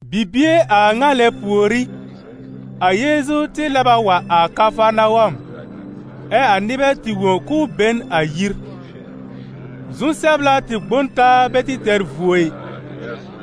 Bibie a ŋa lɛ pùorí, a Yeezu tɩ lɛb a wa a Kafarnawɔm, ɛ a nɩbɛ tɩ wõ k'ʋʋ be n a yir. Zu-sɛbla tɩ gbõ n taa bɛ tɩ tɛr vuo ɩ,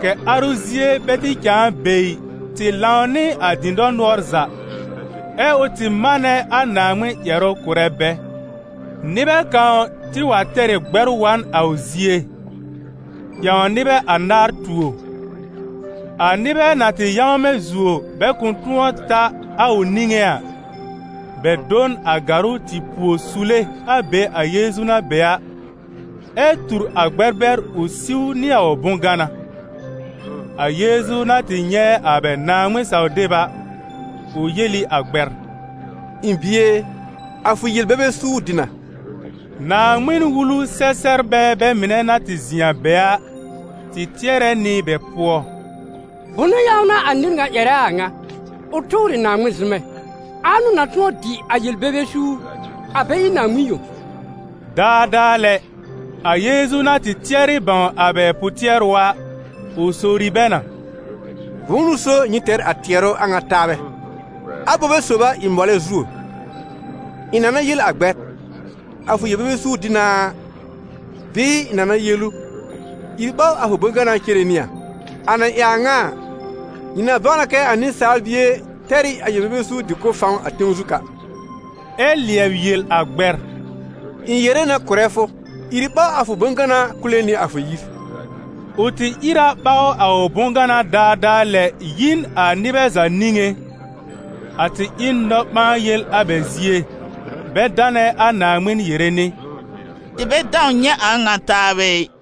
kɛ̀ arʋ zie bɛ tɩ cãa be ɩ, tɩ lãw nɩ a dɩ̃dɔr nʋɔr za, ɛ ʋ tɩ manɛ a Naaŋmɩn ƴɛrʋ kʋ̀rɛ bɛ. Nɩbɛ kãw tɩ wa tɛr ɩ gbɛr wa n a ʋ zie, ƴãw nɩbɛ anaar tuo. A nɩbɛ na tɩ yãwmɛ̃ zuo bɛ kʋ̃ tʋ̃ɔ ta a ʋ niŋé a, bɛ do n a gàrʋ́ tɩ puo sule a be a Yeezu na be a, ɛ tur a gbɛr bɛr ʋ siw nɩ a ʋ bʋ̃-gana. A Yeezu na tɩ nyɛ̃ a bɛ Naaŋmɩn-saw-deb a, ʋ yel ɩ a gbɛr: «Ɩ̃ bie e, a fʋ yel-bebe suur dɩ na.» Naaŋmɩn-Wulu-sɛ-sɛbrbɛ bɛ mɩnɛ na tɩ zɩ̃ a be a, tɩ tɩɛrɛ nɩ bɛ pʋɔ: «Bʋnʋ ƴãw n'a a nɩr ŋa ƴɛrɛ a ŋa? Ʋ tʋʋr ɩ Naaŋmɩn zʋmɛ. Ãa n'ʋ na tʋ̃ɔ dɩ a yel-bebe suur, a bɛ ɩ Naaŋmɩn yõ?» Daadaa lɛ, a Yeezu na tɩ tɩɛrɩ bãw a bɛ pʋ-tɩɛrʋ a, ʋ sowri bɛ na: «Bʋ̃ʋ n'ʋ so nyɩ tɛr a tɩɛrʋ a ŋa taabɛ? Abobe sob a ɩ mɔlɛ zuo: ɩ̃ na na yel a gbɛr: ‹A fʋ yel-bebe suur dɩ na a›, bɩɩ ɩ̃ na na yel ʋ: ‹Ìr ɓaw a fʋ bʋ̃-gana cere nɩ a›? A na ɩ a ŋa a, nyɩ na bãw na kɛ a Nɩsaal Bie tɛr ɩ a yel-bebe suur dɩ-kʋ̀b fãw a tẽw zu ka.» Ɛ lɩɛb yel a gbɛr: «Ɩ̃ yere na kʋ̀rɛ fʋ, ìr ɓaw a fʋ bʋ̃-gana kule nɩ a fʋ yir.» Ʋ tɩ ìr a ɓaw a ʋ bʋ̃-gana daadaa lɛ yi n a nɩbɛ za niŋé. A tɩ ɩ n nɔ-ɓãa-yel a bɛ zie, bɛ danɛ a Naaŋmɩn yere nɩ: «Tɩ bɛ dãw nyɛ̃ a a ŋa taabɛ ɩ.»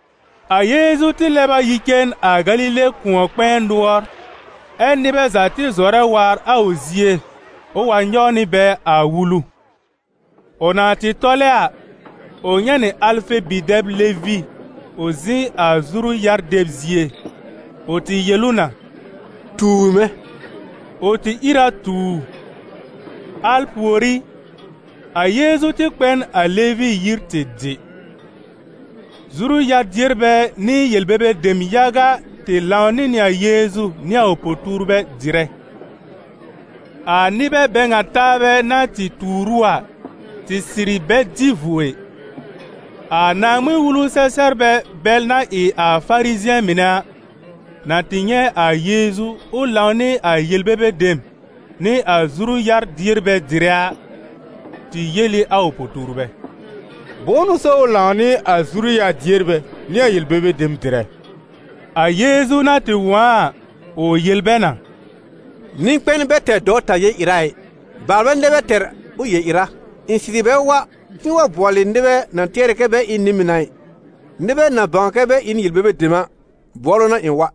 A Yeezu tɩ lɛb a yi cen a Galile kʋ̃ɔ-kpɛ̃ɛ nʋɔr, ɛ́ nɩbɛ za tɩ zɔrɛ waar a ʋ zie ʋ wa nyɔw nɩ bɛ a wulu. Ʋ na tɩ tɔlɛ a, ʋ nyɛ̃ nɩ Alfe bi-dɛb Levi ʋ zɩ̃ a zuru-yar-deb zie. Ʋ tɩ yel ʋ na: «Tuur mɛ̃.» Ʋ tɩ ìr a tu ʋ. Al pùorí, a Yeezu tɩ kpɛ n a Levi yir tɩ dɩ. Zuru-yar-dierbɛ nɩ yel-bebe dem yaga tɩ lãw nɩ nɩ a Yeezu nɩ a ʋ po-tuurbɛ dɩrɛ; a nɩbɛ bɛ ŋa taabɛ na tɩ tuur ʋ a, tɩ sɩrɩ bɛ dɩ vuo ɩ. A Naaŋmɩn-Wulu-sɛ-sɛbrbɛ bɛl na ɩ Farizɩ̃ɛ mɩnɛ a, na tɩ nyɛ̃ a Yeezu ʋ lãw nɩ a yel-bebe dem nɩ a zuru-yar-dierbɛ dɩrɛ a, tɩ yel ɩ a ʋ po-tuurbɛ: «Bʋ̃ʋ n'ʋ so ʋ lãw nɩ a zuru-yar-dierbɛ nɩ a yel-bebe dem dɩrɛ?» A Yeezu na tɩ wõ a a, ʋ yel bɛ na: «Nɩ-kpɛn bɛ tɛr dɔwta yel-ɩra ɩ, baalbɛ nɛ bɛ tɛr ʋ yel-ɩra. Ɩ̃ sɩrɩ bɛ wa k'ɩ̃ɩ wa bʋɔlɩ nɩbɛ na tɩɛrɛ kɛ bɛ ɩ n nɩ-mɩn a ɩ, nɩbɛ na bãw kɛ bɛ ɩ n yel-bebe dem a bʋɔlʋ n'a ɩ̃ wa.»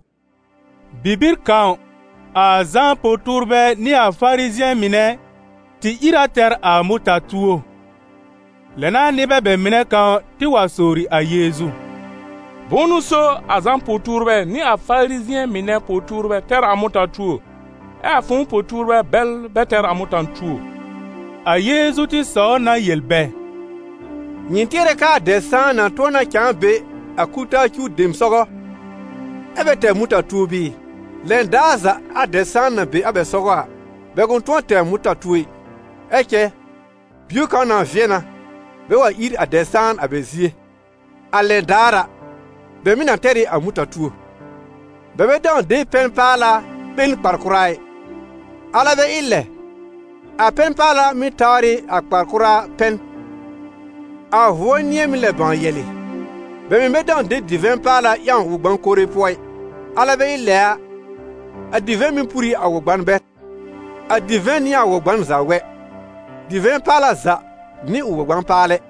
Bibir kãw, a Zã po-tuurbɛ nɩ a Farizɩ̃ɛ mɩnɛ tɩ ìr a tɛr a mʋta-tuo. Lɛ n'a nɩbɛ bɛ mɩnɛ kãw tɩ wa sowri a Yeezu: «Bʋ̃ʋ n'ʋ so a Zã po-tuurbɛ nɩ a Farizɩ̃ɛ mɩnɛ po-tuurbɛ tɛr a mʋta-tuo, ɛ a fʋ̃ʋ po-tuurbɛ bɛl bɛ tɛr a mʋta-tuo?» A Yeezu tɩ sɔw na yel bɛ: «Nyɩ tɩɛrɛ kɛ a dɛb-sãan na tʋ̃ɔ na cãa be a kul-taa cuw dem sɔgɔ, ɛ́ bɛ tɛr a mʋta-tuo bɩɩ? Lɛn daar za a dɛb-sãan na be a bɛ sɔgɔ a, bɛ kʋ̃ tʋ̃ɔ tɛr a mʋta-tuo ɩ. Ɛ cɛ bio kãw na vɩɛ na, bɛ wa ír a dɛb-sãan a bɛ zie, a lɛn daar a, bɛ mɩ̀ na tɛr ɩ a mʋta-tuo. Bɛ bɛ dãw de pɛn-paala ɓe n kpar-kʋra ɩ, alɛ bɛ ɩ lɛ, a pɛn-paala mɩ́ tawr ɩ a kpar-kʋra pɛn, a vʋɔr nɩ̃ɛ mɩ́ lɛb bãw yɛ̀lɩ̀. Bɛ mɩ̀ bɛ dãw de divɛ̃ paala ƴãw wɔ-gbã-kore pʋɔ ɩ; alɛ bɛ ɩ lɛ a, a divɛ̃ mɩ́ pur ɩ a wɔ-gban bɛr, a divɛ̃ nɩ a wɔ-gban za wɛ. Divɛ̃ paala za nɩ ʋ wɔ-gbã-paalɛ.»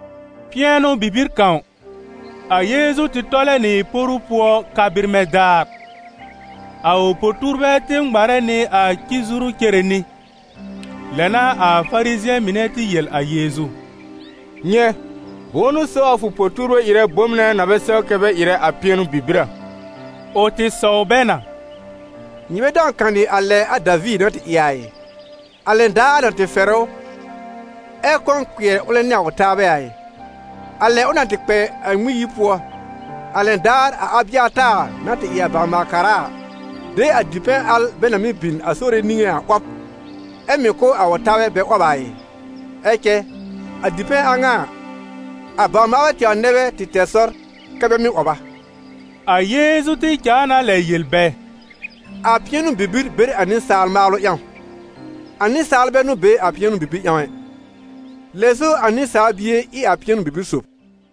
Pɩɛnʋ-bibir kãw, a Yeezu tɩ tɔlɛ nɩ poru pʋɔ ka-bɩrmɛ̃ daar. A ʋ po-tuurbɛ tɩ ŋmarɛ nɩ a ci-zuru cere nɩ. Lɛ n'a a Farizɩ̃ɛ mɩnɛ tɩ yel a Yeezu: «Nyɛ̃, bʋ̃ʋ n'ʋ so a fʋ po-tuurbɛ ɩrɛ bom nɛ na bɛ sɛw kɛ bɛ ɩrɛ a pɩɛnʋ-bibir a?» Ʋ tɩ sɔw bɛ na: «Nyɩ bɛ dãw kanɩ a lɛ a Daviir na tɩ ɩ a ɩ? A lɛn daar a na tɩ fɛrɛ ʋ, ɛ kɔ̃ kpɩɛr ʋlɛ nɩ a ʋ taabɛ a ɩ? A lɛ ʋ na tɩ kpɛ a Ŋmɩn-yir pʋɔ, a lɛn daar a Abɩataar na tɩ ɩ a bawr-maal-kara a, de a dipɛ̃ al bɛ na mɩ́ bin a Sore niŋé a 'wɔb, ɛ mɩ̀ kʋ̀ a ʋ taabɛ bɛ 'wɔb a ɩ? Ɛ cɛ a dipɛ̃ a ŋa a, bawr-maalbɛ tɛwr nɛ bɛ tɩ tɛr sɔr kɛ bɛ mɩ́ 'wɔb a.» A Yeezu tɩ cãa na lɛ yel bɛ: «A pɩɛnʋ-bibir be n a nɩsaal maalʋ ƴãw, a nɩsaal bɛ n'ʋ be a pɩɛnʋ-bibir ƴãw ɛ. Lɛ so, a Nɩsaal Bie ɩ a pɩɛnʋ-bibir sòb.»